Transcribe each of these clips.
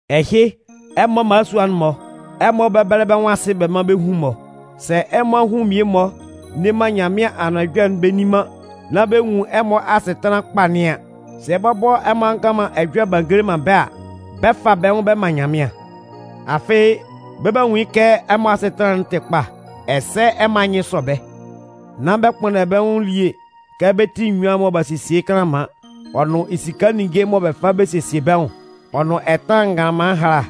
Ɛhɩ, ɛmɔ mmalasua'n-mɔ, ɛmɔ bɛ́bɛlɛ bɛ́ nwʋn asɩ bɛ́ mán bɛ́ hun-mɔ. Sɛ ɛmɔ ahun mmie-mɔ nne man Nyanmɩan Anʋan Ɛjɔlɛ'n bɛ nni man nán bɛ nwun ɛmɔ asɩtanlan kpa nɩn an, sɛ bɔbɔ ɛmɔ a ngan man ɛjɔlɛ b'a ngele man bɛ́ a, bɛ 'fa bɛ́ nwʋn bɛ man Nyanmɩan. Afɩ bɛ 'ba nwun yɩ́ kɛ ɛmɔ asɩtanlan'n tɩ kpa, ɛsɛ ɛmɔ anyɩn sɔ bɛ́. Nán bɛ kpʋnndɛ bɛ́ nwʋn elie kɛ bɛ́ ti enyuan mɔ b'a sesie yɩ́ kanlanman, ɔ nʋn esika ninnge mɔ bɛ fa bɛ sesie bɛ́ nwʋn, ɔ nʋn ɛtanlan nganlanman ɛhala.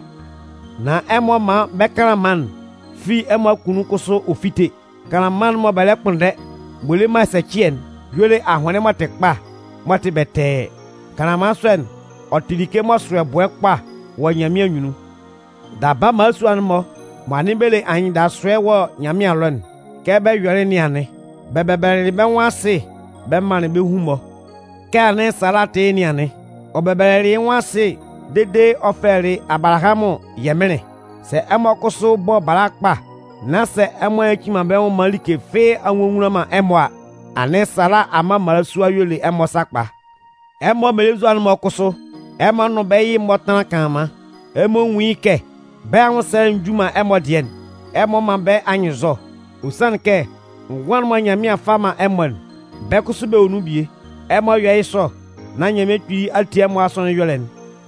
Nan ɛmɔ mán ɛmɔ kanlanman'n fi ɛmɔ akunnun kʋsʋ ɔ fíte. Kanlanman'n mɔ bɛ lɛ kpʋnndɛ m'ɔ le man ɛsɛcɩɛ'n y'ɔ le ahʋnlɩn m'ɔ tɩ kpa, m'ɔ tɩ bɛtɛɛ. Kanlanman sɔ'n, ɔ tɩ like m'ɔ sʋ ɛbʋɛ kpa wɔ Nyanmɩan anyunnun. Daba mmalasua'n-mɔ mɔ anɩn bɛ le anyɩndasʋɛ wɔ Nyanmɩan ɛlɔ'n, kɛ bɛ yɔlɩ yɩ́ nɩn anɩn. Bɛ bɛbɛlɛlɩ bɛ́ nwʋn asɩ bɛ manlɩn bɛ́ hun-mɔ. Kɛ anɩn Sala tɩ yɩ́ nɩn anɩn. Ɔ bɛbɛlɛlɩ yɩ́ nwʋn asɩ dede ɔ fɛlɛlɩ Abalahamʋn “Yɛmɩnlɩn”. Sɛ ɛmɔ kʋsʋ bɔ bala kpa, nán sɛ ɛmɔ a nyaci man bɛ́ nwʋn maan like fɩ́ɩ́ a nnwonwunlan man ɛmɔ a, anɩn Sala amma mmalasua y'ɔ le ɛmɔ sakpa. Ɛmɔ mmelenzua'n-mɔ kʋsʋ, ɛmɔ nʋn bɛ́ yɩ-mɔ tánlan kanlanman. Ɛmɔ nwún yɩ́ kɛ bɛ́ anwʋnsɛlɛ'n nju man ɛmɔ dɩɛ'n. Ɛmɔ mán bɛ́ anyɩnnzɔ. Ɔ sanlɩn kɛ ngʋan'n mɔ Nyanmɩan 'fa man ɛmɔ'n, bɛ́ kʋsʋ bɛ wɔ nun bie. Ɛmɔ yɔ́ yɩ́ sɔ, nán Nyanmɩan Kpili a tie ɛmɔ asɔnɩn ɛyɔlɛ'n.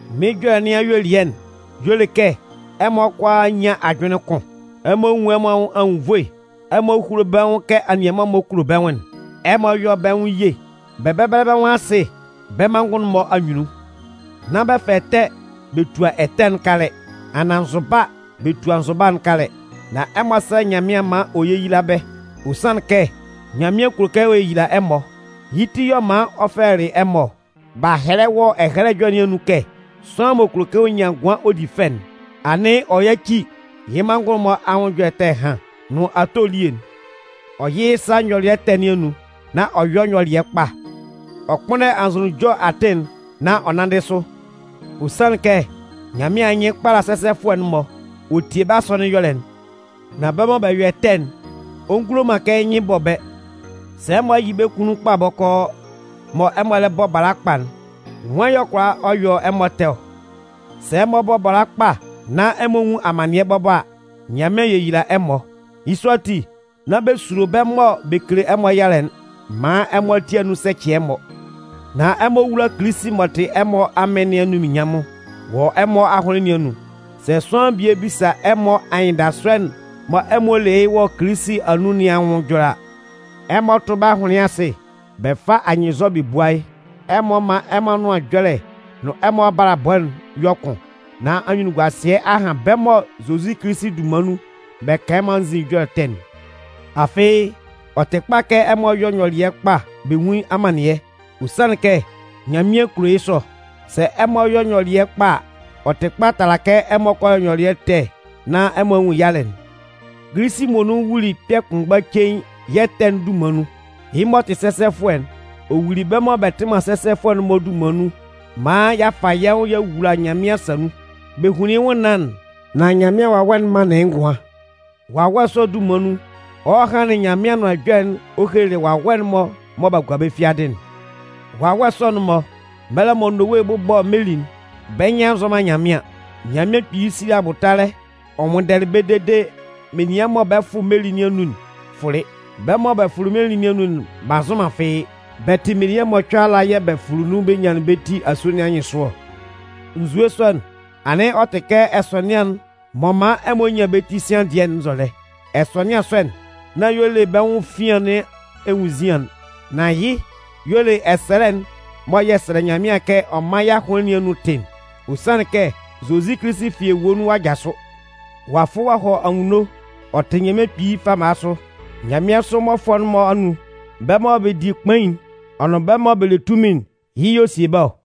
Mɩ́n ɛjɔlɛ nɩn ayuelɩɛ'n y'ɔ le kɛ ɛmɔ kʋalaa nyán ajʋnlɩn kʋn. Ɛmɔ nwún ɛmɔ anwʋn anwunnvoe. Ɛmɔ húlo bɛ́ nwʋn kɛ anianman-mɔ kulo bɛ́ nwʋn'n. Ɛmɔ yɔ́ bɛ́ nwʋn ye, bɛ bɛ́bɛlɛ bɛ́ nwʋn asɩ bɛ́ manngʋn'n-mɔ anyunnun. Nán bɛ fa ɛtɛ bɛ tua ɛtɛ'n kalɛ, anaan nzʋba bɛ tua nzʋba'n kalɛ. Nan ɛmɔ sɛ́lɛ Nyanmɩan maan ɔ yéyila bɛ́. Ɔ sanlɩn kɛ Nyanmɩan kulo kɛ ɔ yeyila ɛmɔ, yɩ́ ti y'ɔ man ɔ fɛlɛlɩ ɛmɔ ɔ. B'a hɛlɛ wɔ Ɛhɛlɛ Ɛjɔlɛ nɩn anun kɛ: Sʋanlan m'ɔ kulo kɛ ɔ nyan ngʋan ɔ di fɛ'n, anɩn ɔ yáci yɩ́ manngʋn'n-mɔ anwʋn ɛjɔlɛ ɛtɛ ɛhan nʋn ato elie'n. Ɔ yɩ́ yɩ́ sa nyɔlɩɛ ɛtɛ nɩn anun, nán ɔ yɔ́ nyɔlɩɛ kpa. Ɔ kpʋ́nndɛ anzʋnunjɔ atɩn'n, nán ɔ nánndɩ sʋ. Ɔ sanlɩn kɛ Nyanmɩan anyɩn kpala sɛsɛfʋɛ'n-mɔ, ɔ tie bɛ́ asɔnɩn ɛyɔlɛ'n. Nan bɛ́ mɔ bɛ yɔ ɛtɛ'n, ɔ ngulo man kɛ yɩ́ nyɩn bɔ bɛ́. Sɛ ɛmɔ yɩ bɛ́ kunnun kpa bɔkɔɔ, mɔ ɛmɔ lɛ bɔ bala kpa'n, nwan y'ɔ kʋala ɔ yɔ ɛmɔ ɛtɛ ɔ? Sɛ ɛmɔ bɔ bala kpa nán ɛmɔ nwun amannɩɛ bɔbɔ a, Nyanmɩan 'yeyila ɛmɔ. Yɩ́ sɔ ati, nán bɛ sulo bɛ́ mɔ bɛ kele ɛmɔ yalɛ'n maan ɛmɔ ati anun sɛcɩ ɛmɔ. Nan ɛmɔ wúla Kilisi m'ɔ tɩ ɛmɔ Amɩn nɩn anunminnyanmʋn wɔ ɛmɔ ahʋnlɩn nɩn anun. Sɛ sʋanlan bie bisa ɛmɔ anyɩndasʋɛ'n mɔ ɛmɔ le yɩ́ wɔ Kilisi anun nɩn anwʋn ɛjɔlɛ a, ɛmɔ tʋ́ bɛ́ ahʋnlɩn asɩ bɛ fá anyɩnnzɔ bɛ búa yɩ́. Ɛmɔ mán ɛmɔ anʋan ɛjɔlɛ nʋn ɛmɔ abalabɔ'n yɔ́ kʋn, nán anyunnunguasɩɛ a han bɛ́ mɔ Zozi Kilisi dunman nun bɛ kan ɛmɔ anzin ɛjɔlɛ ɛtɛ'n. Afɩ ɔ tɩ kpa kɛ ɛmɔ yɔ́ nyɔlɩɛ kpa bɛ nwún amannɩɛ, ɔ sanlɩn kɛ Nyanmɩan kulo yɩ́ sɔ. Sɛ ɛmɔ yɔ nyɔlɩɛ kpa a, ɔ tɩ kpa tala kɛ ɛmɔ kɔ yɔ nyɔlɩɛ ɛtɛ nán ɛmɔ a nwun yalɛ'n. Kilisi muonun wuli kpɛ̂ kʋnmgba cein yɛ́ ɛtɛ'n dunman nun. Yɩ́ m'ɔ tɩ sɛsɛfʋɛ'n, ɔ wuli bɛ́ mɔ bɛ tɩ man sɛsɛfʋɛ'n-mɔ dunman nun maan y'a fa yɛ́ nwʋn y'a wula Nyanmɩan asa nun. Bɛ hunlin yɩ́ nwʋnnaan'n, nan Nyanmɩan Wawɛ'n manlɩn yɩ́ ngʋan. Wawɛ sɔ'n dunman nun, ɔ hɔlɩ hanlɩn Nyanmɩan Anʋan Ɛjɔlɛ'n ɔ helelɩ wawɛ'n-mɔ mɔ b'a gua bɛ́ fiadɩ'n. Wawɛ sɔ'n-mɔ, mɛlɛ mɔ Nowe 'bʋbɔ meli'n, bɛ́ nyɩn a nzɔ man Nyanmɩan. Nyanmɩan Kpili sili abʋtalɛ ɔ nwʋnndɛlɩ bɛ́ dede, menian mɔ bɛ 'fʋ meli nɩn anun'n fʋlɩ. Bɛ́ mɔ bɛ fʋlɩ meli nɩn anun'n b'a nzʋn man fɩ́ɩ́. Bɛ tɩ menian mɔcʋɛ ala yɛ́ bɛ fʋlɩ nun bɛ nyanlɩn bɛ́ ti asue nɩn anyɩnsʋ ɔ. Nzue sɔ'n, anɩn ɔ tɩ kɛ ɛsɔnɩan'n m'ɔ man ɛmɔ nyan bɛ́ ti sian dɩɛ'n nzɔlɛ. Ɛsɔnɩan sɔ'n, nán y'ɔ le bɛ́ nwʋn efian nɩn enwunnzian'n. Nan yɩ́ y'ɔ le ɛsɛlɛ'n mɔ yɛ sɛlɛ Nyanmɩan kɛ ɔ mán yɛ́ ahʋnlɩn nɩn anun tɩ'n. Ɔ sanlɩn kɛ Zozi Kilisi fi ewue nun ɔ'a jasʋ. Ɔ'a fʋ ɔ'a hɔ anwunno, ɔ tɩ Nyanmɩan Kpili fama sʋ. Nyanmɩansʋ mmɔfʋɛ'n-mɔ anun, bɛ́ mɔ bɛ di kpain'n ɔ nʋn bɛ́ mɔ bɛ le tunmin'n, yɩ́ y'ɔ sie bɛ́ ɔ.